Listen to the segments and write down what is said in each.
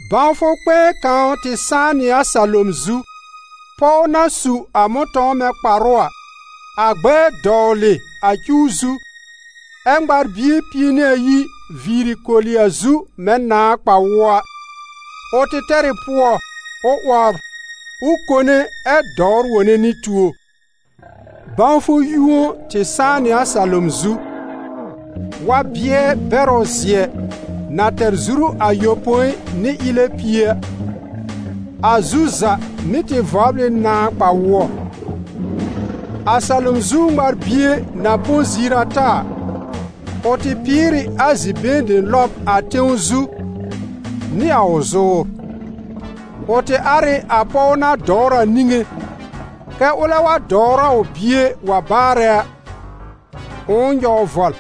Bãwfʋ kpɛ̃ɛ kãw tɩ sãá nɩ a salom zu: pɔw na su a mʋ̃tɔ̃w mɛ̃ kparʋ a, a gbɛɛ dɔwlɩ a cuw zu, ɛ́ ŋmar-bie pie nɩ ayi viiri koli a zu mɛ̃ nãà kpa-wʋɔ a. Ʋ tɩ tɛr ɩ pʋɔ, ʋ 'wɔbr, ʋ kone ɛ dɔwr wone nɩ tuo. Bãwfʋ yũo tɩ sãá nɩ a salom zu: wa-bɩɛ bɛrʋ zɩ̀ɛ na tɛr zuru ayopõi nɩ ɩlɛ pie a, a zu za mɩ́ tɩ vɔbl ɩ nãà kpa-wʋɔ. A salom zu ŋmar-bie na põ ziir ata a, ʋ tɩ pɩɩr ɩ a zi-been dem lɔb a tẽw zu nɩ a ʋ zʋʋr. Ʋ tɩ ar ɩ a pɔw na dɔwr a niŋé, kɛ́ ʋlɛ wa dɔwr a ʋ bie wa baarɛ a, ʋ̃ʋ nyɔw vɔl.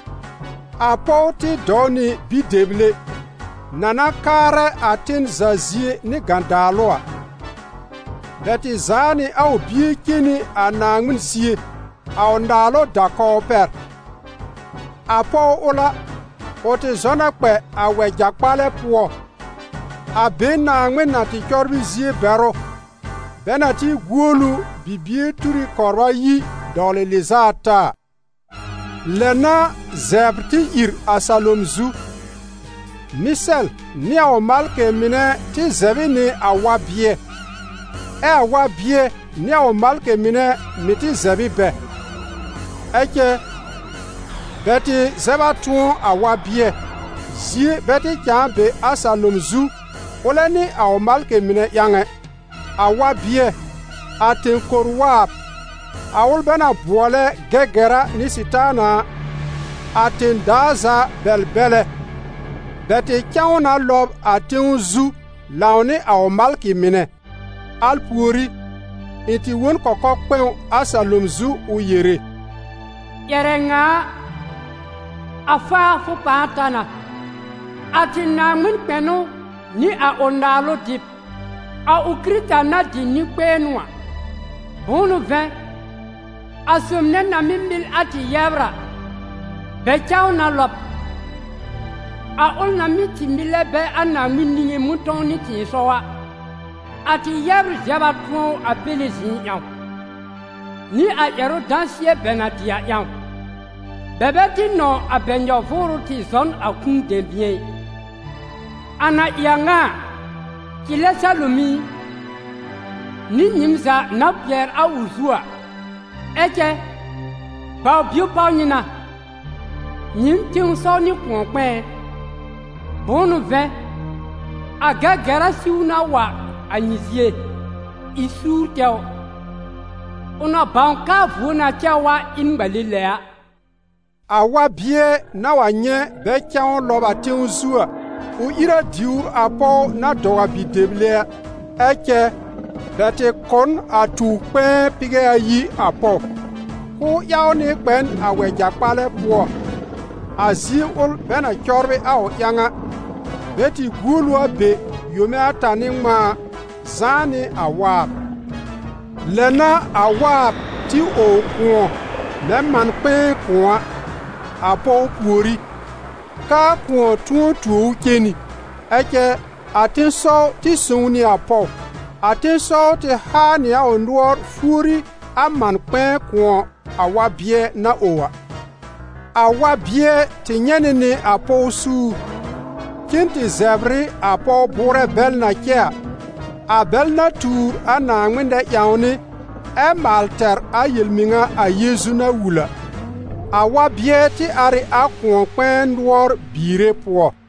A pɔw tɩ dɔw nɩ bi-dɛble, na na kaarɛ a ten za zie nɩ gãdaalʋ a. Bɛ tɩ zaa nɩ a ʋ bie cen nɩ a Naaŋmɩn zie, a ʋ naalʋ da-kɔw pɛr. A pɔw ʋl a, ʋ tɩ zɔ na kpɛ a wɛja kpalɛ pʋɔ, a be Naaŋmɩn na tɩ cɔbrɩ zie bɛr ʋ, bɛ na tɩ guol ʋ bibie tur ɩ kɔbr ayi dɔwlɩ lɩz'a ata a. Lɛ n'a zɛbr tɩ ìr a salom zu: Mɩsɛl nɩ a ʋ malkɩ mɩnɛ tɩ zɛb ɩ nɩ a wa-bɩɛ, ɛ a wa-bɩɛ nɩ a ʋ malkɩ mɩnɛ mɩ̀ tɩ zɛb ɩ bɛ. Ɛ cɛ, bɛ tɩ zɛb a tʋ̃ɔ a wa-bɩɛ, zie bɛ tɩ cãa be a salom zu ʋlɛ nɩ a ʋ malkɩ mɩnɛ ƴãw ɛ. A wa-bɩɛ, a tẽ-kor-waab, a ʋl bɛ na bʋɔlɛ Gɛgɛra nɩ Sɩtaana a, a tẽ-daa za bɛl-bɛlɛ, bɛ tɩ cã ʋ na lɔb a tẽw zu lãwnɩ a ʋ malkɩ mɩnɛ. Al pùorí, ɩ̃ tɩ wõ n kɔkɔ-kpɛ̃w a salom zu ʋ yere: «Ƴɛrɛ ŋa a, a faafʋ pãa ta na, a tɩ Naaŋmɩn kpɛnʋ nɩ a ʋ naalʋ dɩb, a ʋ Kɩrɩta na dɩ nɩ-kpɛ̃ɛnʋ a. Bʋ̃ʋ n'ʋ vɛ̃, a sob nɛ na mɩ́ mɩl a tɩ yɛbr a, bɛ cã ʋ na lɔb, a ʋl na mɩ́ tɩ mɩlɛ bɛ a Naaŋmɩn niŋé mʋ̃tɔ̃w nɩ tɩ̃ɩsɔw a. A tɩ yɛbr zɛb a tʋ̃ɔ ʋ a Péle zɩ̃ɩ ƴãw, nɩ a ƴɛrʋ dãsɩɛ bɛ na dɩ a ƴãw; bɛ bɛ tɩ nɔ̃w a bɛ nyɔ-vʋʋrʋ tɩ zɔ n a kũu dɛ̃bɩ̃ɛ ɩ. A na ɩ a ŋa a, cɩlɛ salom i, nɩ nyɩɩm za na kpɩɛr a ʋ zu a! Ɛ cɛ, baw-bio páw nyɩ na, nyɩɩm tẽ-sɔw nɩ kʋ̃ɔ-kpɛ̃ɛ ɛ! Bʋ̃ʋ n'ʋ vɛ̃, a Gɛgɛra siw na wa a nyɩ zie, ɩ suur tɛwr, ʋ na bãw k'aa vuo na cɛ ʋ a ɩ n ŋmale lɛ a.» A wa-bɩɛ na wa nyɛ̃ bɛ cã ʋ lɔb a tẽw zu a, ʋ ìr a diwr a pɔw na dɔw a bi-dɛble a. Ɛ cɛ, bɛ tɩ kʋ̀ n a tuw-kpɛ̃ɛ pɩgɛ ayi a pɔw, k'ʋʋ ƴaw nɩ kpɛ n a wɛja kpalɛ pʋɔ, a zie ʋl bɛ na cɔbrɩ a ʋ ƴãw a, bɛ tɩ guol ʋ a be yome ata nɩ ŋmãa, zãá nɩ a waab. Lɛ n'a a waab tɩ ow kʋ̃ɔ mɛ̃ man-kpɛ̃ɛ kʋ̃ɔ a, a pɔw pùorí, k'aa kʋ̃ɔ tʋ̃ɔ tuo ʋ cen nɩ. Ɛ cɛ, a tẽ-sɔw tɩ sõw nɩ a pɔw: a tẽ-sɔw tɩ haa nɩ a ʋ nʋɔr fuori a man-kpɛ̃ɛ kʋ̃ɔ a wa-bɩɛ na ow a. A wa-bɩɛ tɩ nyɛ̃ nɩ nɩ a pɔw suur, cen tɩ zɛbr ɩ a pɔw bʋʋrɛ bɛl na cɛ a, a bɛl na tuur a Naaŋmɩn nɛ-ƴãwnɩ ɛ maal tɛr a yel-mɩŋa a Yeezu na wul a. A wa-bɩɛ tɩ ar ɩ a kʋ̃ɔ-kpɛ̃ɛ nʋɔr biire pʋɔ.